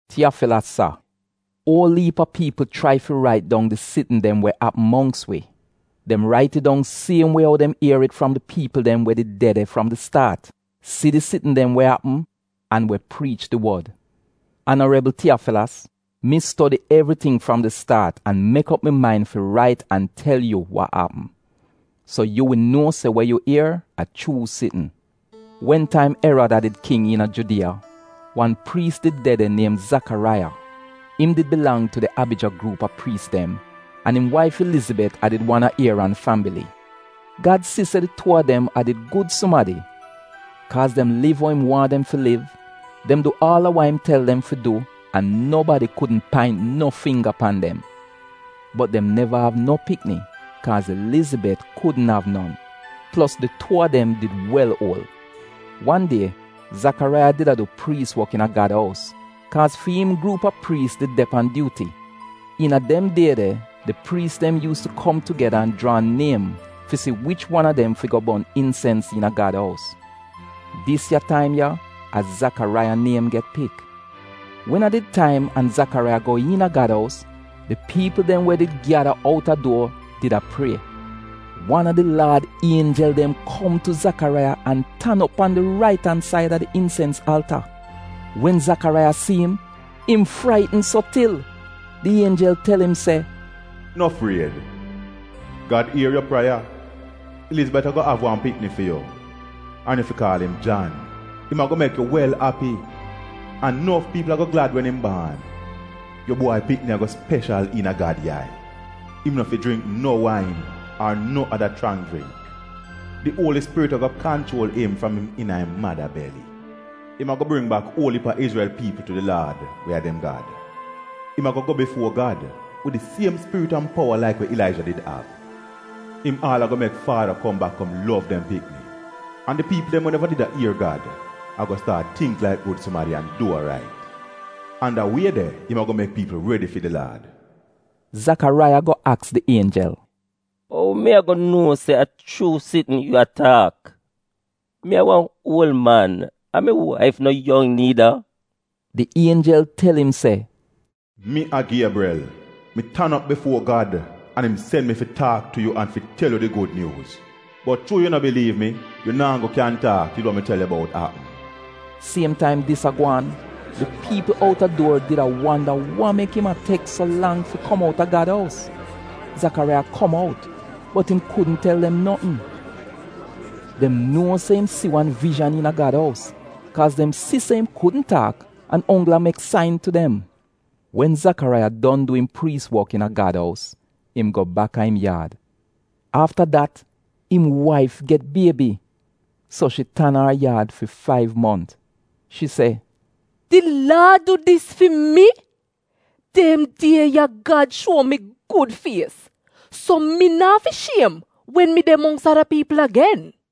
Tiyafilas Sa, Uol iip a piipl chrai fi rait dong di sitn dem wa apm mongks wi. Dem rait it dong siem wie ou dem ier it fram di piipl dem we did de de fram di staat, si di sitn dem wa apm an we priich di wod. Anarebl Tiyafilas, mi stodi evriting fram di staat an mek op mi main fi rait an tel yu wa apm, so yu wi nuo se wa yu ier a chuu sitn. Wen taim Erad a did King iina Judiya, wan priis did de de, niem Zakaraiya. Im did bilang tu di Abija gruup a priis dem, an im waif Ilizibet a did wan a Ieran fambili. Gad si se di tuu a dem a did gud sumadi. Kaaz dem liv ou im waahn dem fi liv, dem du aal a wa im tel dem fi du an nobadi kudn paint no fingga pan dem. Bot dem neva av no pikni, kaaz Ilizibet kudn av non. Plos di tuu a dem did wel uol. Wan die, Zakaraiya did a du priis wok iina Gad ous, kaaz fi im gruup a priis did de pan dyuuti. Iina dem die de di priis dem yuus tu kom tugeda an jraa niem fi si wich wan a dem fi go bon insens iina Gad ous. Dis ya taim ya a Zakaraiya niem get pik. Wen a did taim an Zakaraiya go iina Gad ous, di piipl dem we did gyada outa duor did a prie. Wan a di Laad ienjel dem kom tu Zakaraiya an tan op pan di rait-an-said a di insens alta. Wen Zakaraiya si im, im fraitn so til. Di ienjel tel im se, “No fried! Gad ier yu prieya. Ilizibet ago av wan pikni fi yu, an yu fi kaal im Jan. Im ago mek yu wel api, an nof piipl ago glad wen im baan. Yu bwai pikni ago speshal iina Gad yai. Im no fi jringk no wain ar no ada chrang jringk. Di Uoli Spirit ago kanchuol im fram im iina im mada beli. Im ago bring bak uol iip a Izrel piipl tu di Laad, we a dem Gad. Im ago go bifuo Gad, wid di siem Spirit an powa laik wa Ilaija did av. Im aal ago mek faada kom bak kom lov dem pikni. An di piipl dem we neva did a ier Gad, ago staat tingk laik gud sumadi an du wa rait. An da wie de im ago mek piipl redi fi di Laad.” Zakaraiya go aks di ienjel, “Ou mi ago nuo se a chuu sitn yu a taak? Mi a wan uol man, an mi waif no yong niida.” Di ienjel tel im se, “Mi a Giebrel. Mi tan op bifuo Gad an im sen mi fi taak tu yu an fi tel yu di gud nyuuz. Bot chuu yu no biliiv mi, yu naa go kyan taak til wa mi tel yu bout apm.” Siem taim dis a gwaan, di piipl outa duor did a wanda wa mek im a tek so lang fi kom outa Gad ous. Zakaraiya kom out bot im kudn tel dem notn. Dem nuo se im si wan vijan iina Gad ous, kaaz dem si se im kudn taak an onggl a mek sain tu dem. Wen Zakaraiya don du im priis wok iina Gad ous, im go baka im yaad. Afta dat im waif get biebi, so shi tan a ar yaad fi faiv mont. Shi se, “Di Laad du dis fi mi. Dem die ya, Gad shuo mi gud fies, so mi naa fi shiem wen mi de mongks ada piipl agen.”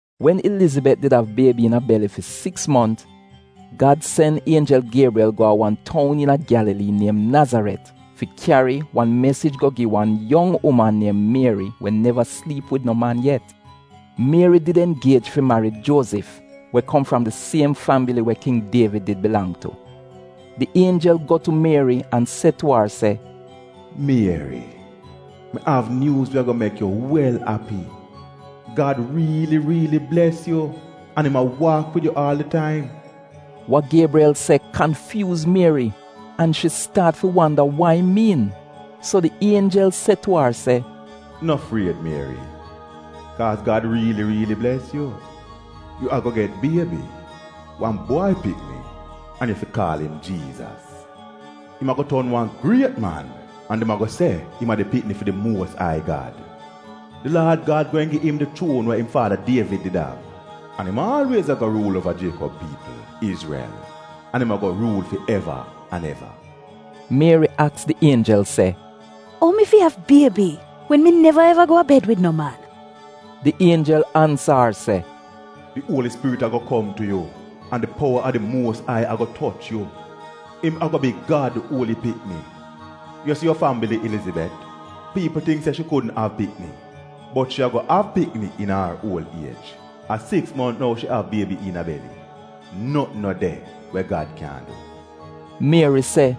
Wen Ilizibet did av biebi iina beli fi siks mont, Gad sen ienjel Giebrel go a wan toun iina Gyalalii niem Nazaret, fi kyari wan mesij go gi wan yong uman niem Mieri we neva sliip wid no man yet. Mieri did ingiej fi marid Juozif, we kom fram di siem fambili we King Dievid did bilang tu. Di ienjel go tu Mieri an se tu ar se, “Mieri, mi av nyuuz we ago mek yu wel api. Gad riili riili bles yu an im a waak wid yu aal di taim.” Wa Giebrel se kanfyuuz Mieri an shi staat fi wanda wa im miin. So di ienjel se tu ar se, “No fried Mieri, kaaz Gad riili riili bles yu. Yu ago get biebi, wan bwai pikni, an yu fi kaal im Jiizas. Im ago ton wan griet man an dem ago se im a di pikni fi di Muos Ai Gad. Di Laad Gad gweehn gi im di chuon wa im faada Dievid did av. An im aalwiez ago ruul uova Jiekob piipl, Izrel; an im ago ruul fi eva an eva.” Mieri aks di ienjel se, “Ou mi fi av biebi wen mi neva eva go a bed wid no man?” Di ienjel ansa ar se, “Di Uoli Spirit ago kom tu yu an di powa a di Muos Ai ago toch yu. Im ago bi Gad uoli pikni. Yu si yu fambili Ilizibet? Piipl tingk se shi kudn av pikni bot shi ago av pikni iina ar uol iej. A siks mont nou shi av biebi iina beli. Notn no de, wa Gad kyaahn du.” Mieri se,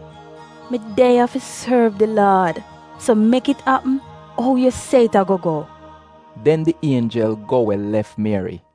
“Mi de ya fi sorv di Laad. So mek it apm ou yu se it ago go.” Den di ienjel go we lef Mieri.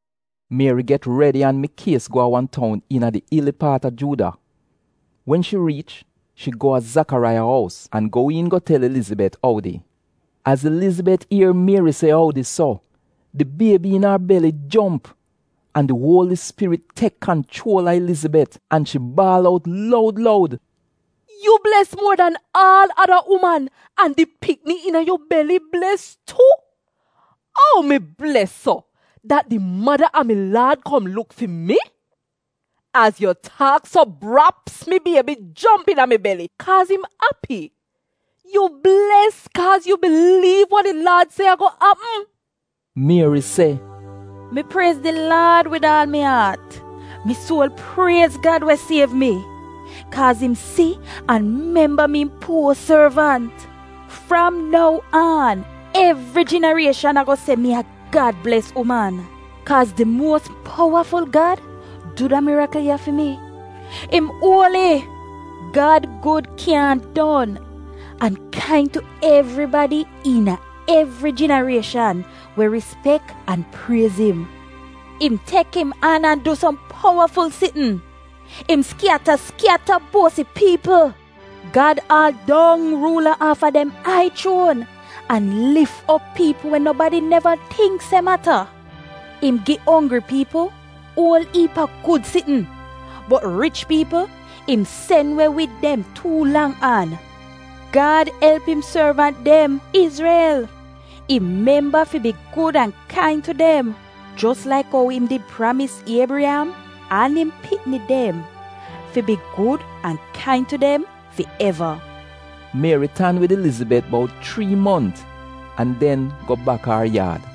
Mieri get redi an mikies go a wan toun iina di ili paat a Juuda. Wen shi riich, shi go a Zakaraiya ous an go iin go tel Ilizibet oudi. Az Ilizibet ier Mieri se oudi so, di biebi iina ar beli jomp. An di Uoli Spirit tek kanchuol a Ilizibet an shi baal out loud loud, “Mieri, yu bles muo dan aal ada uman an di pikni iina yu beli bles tu. Ou mi bles so, dat di mada a mi Laad kom luk fi mi? Az yu taak so braps, mi biebi jomp iina mi beli kaaz im api. Yu bles kaaz yu biliiv wa di Laad se ago apm.” Mieri se: “Mi priez di Laad wid aal mi aat, mi suol priez Gad we siev mi; kaaz im si an memba mi im puo sorvant. Fram nou aan, evri jinarieshan ago se mi a Gad-bles uman, kaaz di Muos Powaful Gad du da mirikl ya fi mi — im uoli! Gad gud kyaahn don, an kain tu evribadi iina evri jinarieshan we rispek an priez im. Im tek im an du som powaful sitn; im skyata skyata buosi piipl. Gad aal dong ruula aafa dem ai chuon an lif op piipl we nobadi neva tingk se mata. Im gi onggri piipl uol iip a gud sitn, bot rich piipl im sen we wid dem tuu lang an. Gad elp im sorvant dem, Izrel. Im memba fi bi gud an kain tu dem jos laik ou im did pramis Iebriyam an im pikni dem, fi bi gud an kain tu dem fi eva.” Mieri tan wid Ilizibet bout chrii mont an den go baka ar yaad.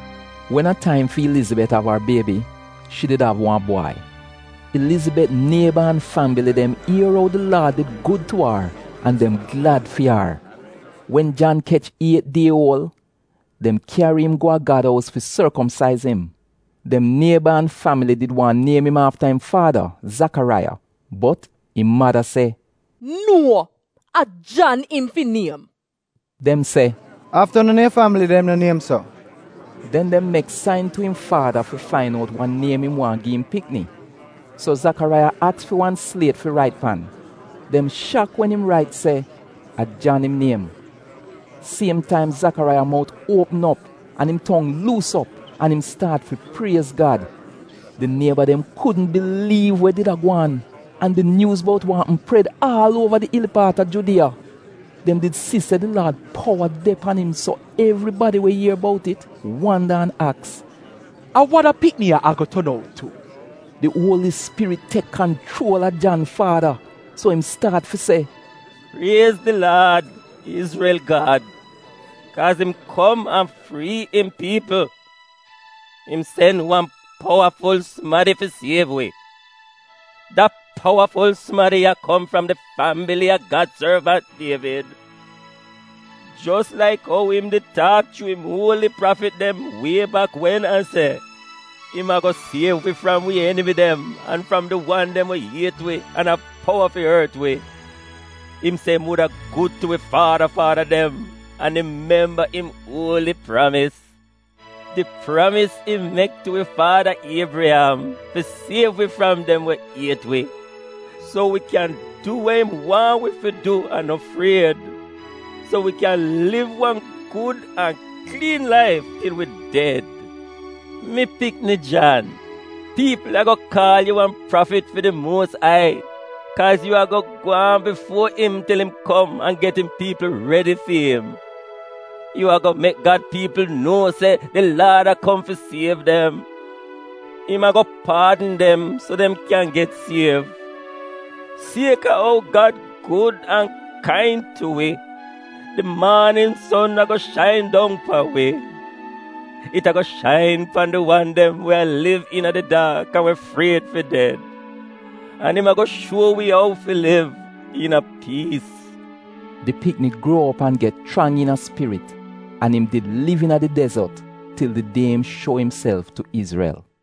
Wen a taim fi Ilizibet av ar biebi, shi did av wan bwai. Ilizibet nieba an fambili dem ier ou di Laad did gud tu ar an dem glad fi ar. Wen Jan kech iet die uol, dem kyari im go a Gad ous fi sorkomsaiz im. Dem nieba an fambili did waahn niem im afta im faada, Zakaraiya, bot im mada se, “Nuo! A Jan im fi niem.” Dem se, “Afta non a yu fambili dem no niem so?” Den dem mek sain tu im faada fi fain out wa niem im waahn gi im pikni. So Zakaraiya aks fi wan sliet fi rait pan. Dem shak wen im rait se, “A Jan im niem.” Siem taim Zakaraiya mout uopm op an im tong luus op, an im staat fi priez Gad. Di nieba dem kudn biliiv we did a gwaan, an di nyuuz bout wa apm pred aal uova di ili paat a Judiya. Dem did si se di Laad powa de pan im so evribadi we ier bout it wanda an aks, “A wa da pikni ya ago ton out tu?” Di Uoli Spirit tek kanchuol a Jan faada so im staat fi se: “Priez di Laad, Izrel Gad, kaaz im kom an frii im piipl. Im sen wan powaful sumadi fi siev wi. Da powaful sumadi ya kom fram di fambili a Gad sorvant Dievid. Jos laik ou im did taak chuu im uoli prafit dem wie bak wen an se: im ago siev wi fram wi enimi dem an fram di wan dem we iet wi an av powa fi ort wi. Im se im wuda gud tu wi faada faada dem an im memba im uoli pramis; Di pramis im mek tu wi faada Iebriyam, fi siev wi fram dem we iet wi. So wi kyan du we im waahn wi fi du an no fried; So wi kyan liv wan gud an kliin laif til wi ded. Mi pikni Jan, piipl ago kaal yu wan prafit fi di Muos Ai, kaaz yu ago gwaan bifuo im til im kom an get im piipl redi fi'im; Yu ago mek Gad piipl nuo se di laad a kom fi siev dem; Im ago paadn dem so dem kyan get siev. Sieka ou Gad gud an kain tu wi, di maanin son ago shain dong pan wi. It ago shain pan di wan dem we a liv iina di daak an we fried fi ded. An im ago shuo wi ou fi liv iina piis.” Di pikni gruo op an get chrang iina spirit, an im did liv iina di dezot til di die im shuo imself tu Izrel.